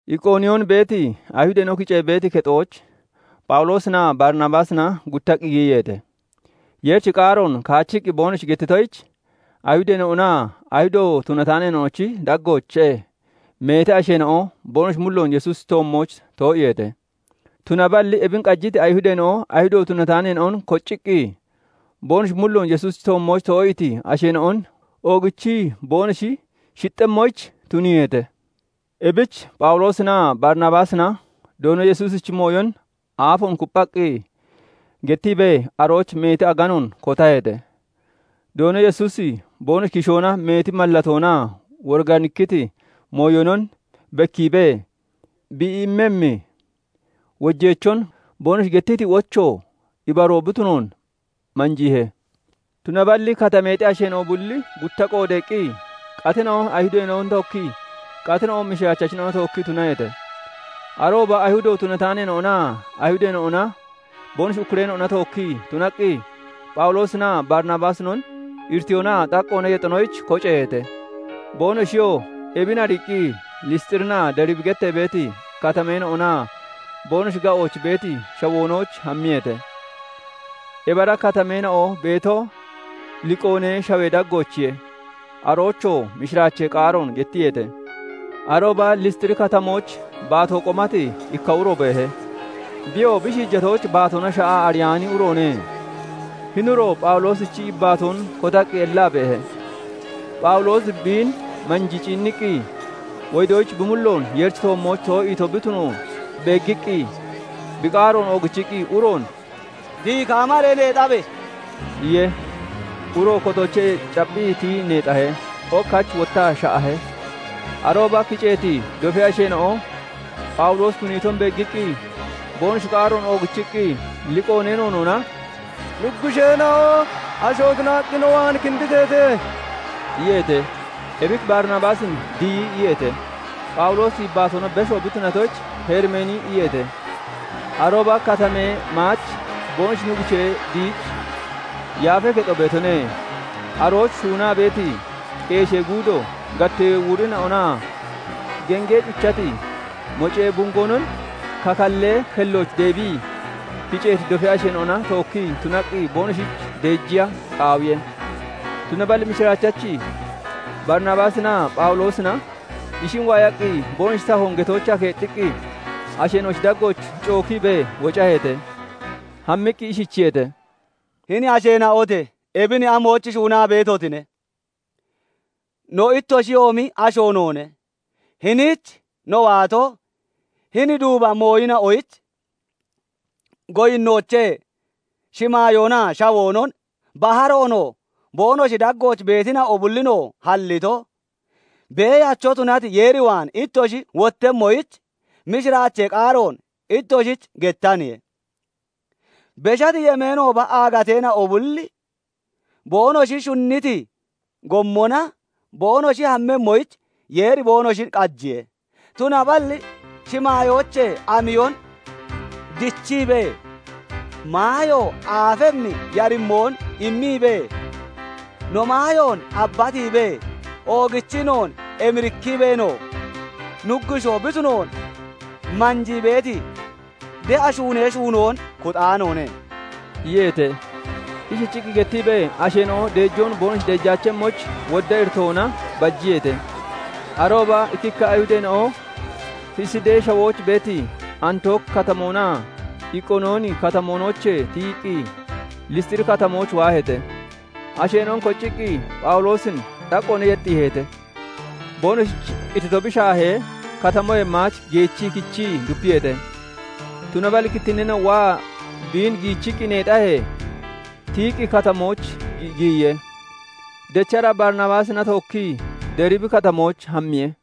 Iqooniyoon beeti Ayihudeena'o kiceeti kexooch Phawuloosinaa Barinabaasina guttaqqi giyiyeete; Yeerichi qaaroon kaachiqqi boonoshi gettitoyich, Ayihudeena'onaa Ayihudo tunataaneena'onochi daggoochee meeti asheena'o boonoshi mulloon Yesuusichi toommooch too'iiheete. Tunaballi ebin qajiti Ayihudeena'o Ayihudo tunataaneena'on kocciqqi, boonoshi mulloon Yesuusichi toommooch too'iiti asheena'on oogichi boonoshi shixxemmoyich tuniiheete. Ebich Phawuloosinaa Barinabaasina Doono Yesuusichi mooyon aafoon kupphaqqi gettiibee, arooch meeti aganoon kotaheete. Doono Yesuusi boonoshi kishoona meeti mallatoonaa woriganikkiti mooyonon bekkiibee, bi immemmi wojeechon boonoshi gettiti wocho ibaroo bi tunoon manjiihe. Tunaballi katameexi asheena'o bulli gutta qoodeeqqi, qatina'o Ayihudeena'ona tookkii, qatina'o mishiraachachina'ona tookkii tunaheete. Arooba Ayihudo tunataaneena'onaa Ayihudeena'ona boonoshi ukkureena'ona tookkii tunaqqi, Phawuloosinaa Barinabaasinon iritiyoonaa xaqqoona yexonoyich koceeheete. Boonoshiyoo ebin ariiqqi Lisxirinaa Deribina gettee beeti katameena'onaa boonoshi ga'ooch beeti shawoonooch hammiyeete; ebi ara katameena'o beeto Liqoonee Shawee daggoochiye. Aroochoo mishiraachee qaaroon gettiyeete. Arooba Lisxiri Katamooch baatoo qomati ikka uro beehe. Biyoo bi shiijatooch, baatoona sha'aa ariyaani uroone. Hini uro Phawuloosichi yibbaatoon kotaqqi ellaa beehe. Phawuloosi biin manjii ciinniqqi, wodoyich bi mulloon Yeerichi toommooch too'iito bi tunoon beeggiqqi, bi qaaroon oogichiqqi uroon "Tiyi kaamaree neexabe!" iye. Uroo kotoochee capphiqqi tiyii neexahe; ok hach wottaa sha'ahe. Arooba kiceeti dofee asheena'o Phawuloosi tuniiton beeggiqqi, boonoshi qaaroon oogichiqqi Liqoonee noonoona "Nuggusheena'o asho tunaqqi no waan kinditeete!" iyeete. Ebich Barinabaasin "Diyi" iyeete; Phawuloosin yibbaatoona beshoo bi tunatoyich, "Herimeeni" iyeete. Arooba katamee maach boonoshi nuggushee Diyichi yaafee kexo beetone; arooch shuunaa beeti, qeeshee guudo gattee wurina'onaa gengee cuchati mocee bungoonon kakallee kellooch deebii, kiceeti dofee asheena'ona tookkii tunaqqi boonoshich deejiya qaawiye. Tunaballi mishiraachachi Barinabaasinaa Phawuloosina ishin waayaqqi, boonoshi tahoon getoochaa keexxiqqi, asheena'ochi daggooch cookiibee wocaheete; hammiqqi ishichiyeete:- "Hini asheena'ote! Ebin amoyich shuunaa beetotine? No ittoshiyoomi asho noone. Hiniich no waato, hini duuba mooyina'oyich goyinnoochee shimaayoonaa shawoonon, baharoonoo, boonoshi daggooch beetina'o bullinoo halliti, Beeyacho tunati Yeer waan ittoshi wottemmoyich, mishiraachee qaaroon ittoshich gettaniye. Beshati yemeenooba aagateena'o bulli boonoshi shunniti gommona boonoshi hammemmoyich Yeeri boonoshin qajiye. Tunaballi shimaayoochee amiyon dichiibee, maayo aafemmi yarimmoon immiibee, no maayoon abbatiibee, oogichii noon emirikkiibeenoo, Nuggushoo bi tunoon manjii beeti de'a shuunee shuunoon kuxaanoone" iyeete. Ishichiqqi gettiibee, asheena'o deejoon boonoshich deejaachemmoyich wodda iritoona bajiyeete. Arooba ikkikka Ayihudeena'o Fesidee Shawooch beeti Antooki Katamoonaa Iqooniyooni Katamoonoochee tiyiqqi, Lisxiri Katamooch waaheete; asheena'on kocciqqi Phawuloosin xaqqoona yexxiiheete. Boonoshich qitito bi shaahee, katamoyee maach geechii kichii dupiyeete. Tunaballi kittinneena'o waa biin giichiqqi neexahee, tiyiqqi katamooch giyiye. Dechara Barinabaasina tookkii Deribi Katamooch hammiye.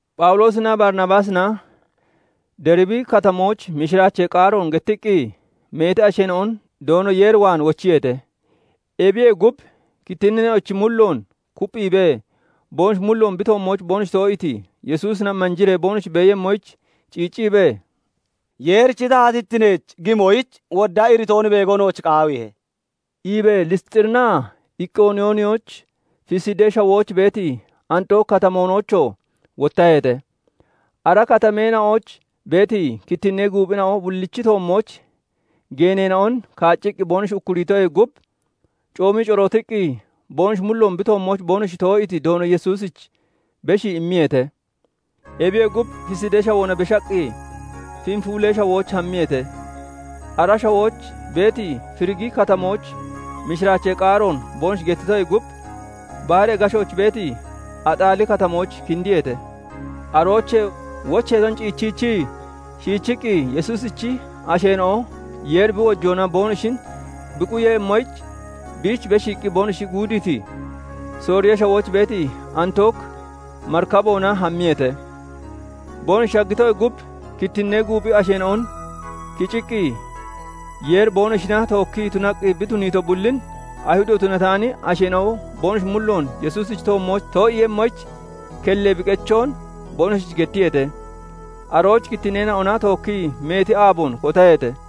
Phawuloosinaa Barinabaasina Deribi Katamooch mishiraachee qaaroon gettiqqi, meeti asheena'on Doono Yeer waan wochiyeete. Ebiyee gub kittinneena'ochi mulloon kupphiibee, boonoshi mulloon bi toommooch boonoshi too'iiti Yesuusina manjiree boonoshi beeyemmoyich ciicciibee, "Yeerichi taatittineech gimoyich wodda iritoon beego nooch qaawiihe" iibee Lisxirinaa Iqooniyooninooch, Fesidee Shawooch beeti Antooki Katamoonoochoo wottaheete. Ara katameena'ooch beeti kittinnee guuphina'o bullichi toommooch geeneena'on kaacciqqi boonoshi ukkuriitoyee gub, coomii corootiqqi, boonoshi mulloon bi toommooch boonoshi too'iiti Doono Yesuusich beshii immiyeete. Ebiyee gub, Fesidee Shawoona beshaqqi, Fenfulee Shawooch hammiyeete. Ara shawooch beeti Ferigi Katamooch mishiraachee qaaroon boonoshi gettitoyee gub, baharee gashooch beeti Axaali Katamooch kindiyeete. Aroochee wocheeton ciichiichii, shiichiqqi Yesuusichi asheena'o Yeeri bi wojoona boonoshin bi quyemmoyich, biich beshiiqqi boonoshi guudiiti, Sooriyee Shawooch beeti Antook marikaboona hammiyeete. Boonoshi shaggitoyee gub, kittinnee guuphi asheena'on kiciqqi, Yeeri boonoshina tookkii tunaqqi bi tuniito bullin, Ayihudo tunataani asheena'o boonoshi mulloon Yesuusichi toommooch too'iiyemmoyich kellee bi qechoon boonoshich gettiyeete. Arooch kittinneena'ona tookkii meeti aaboon kotaheete.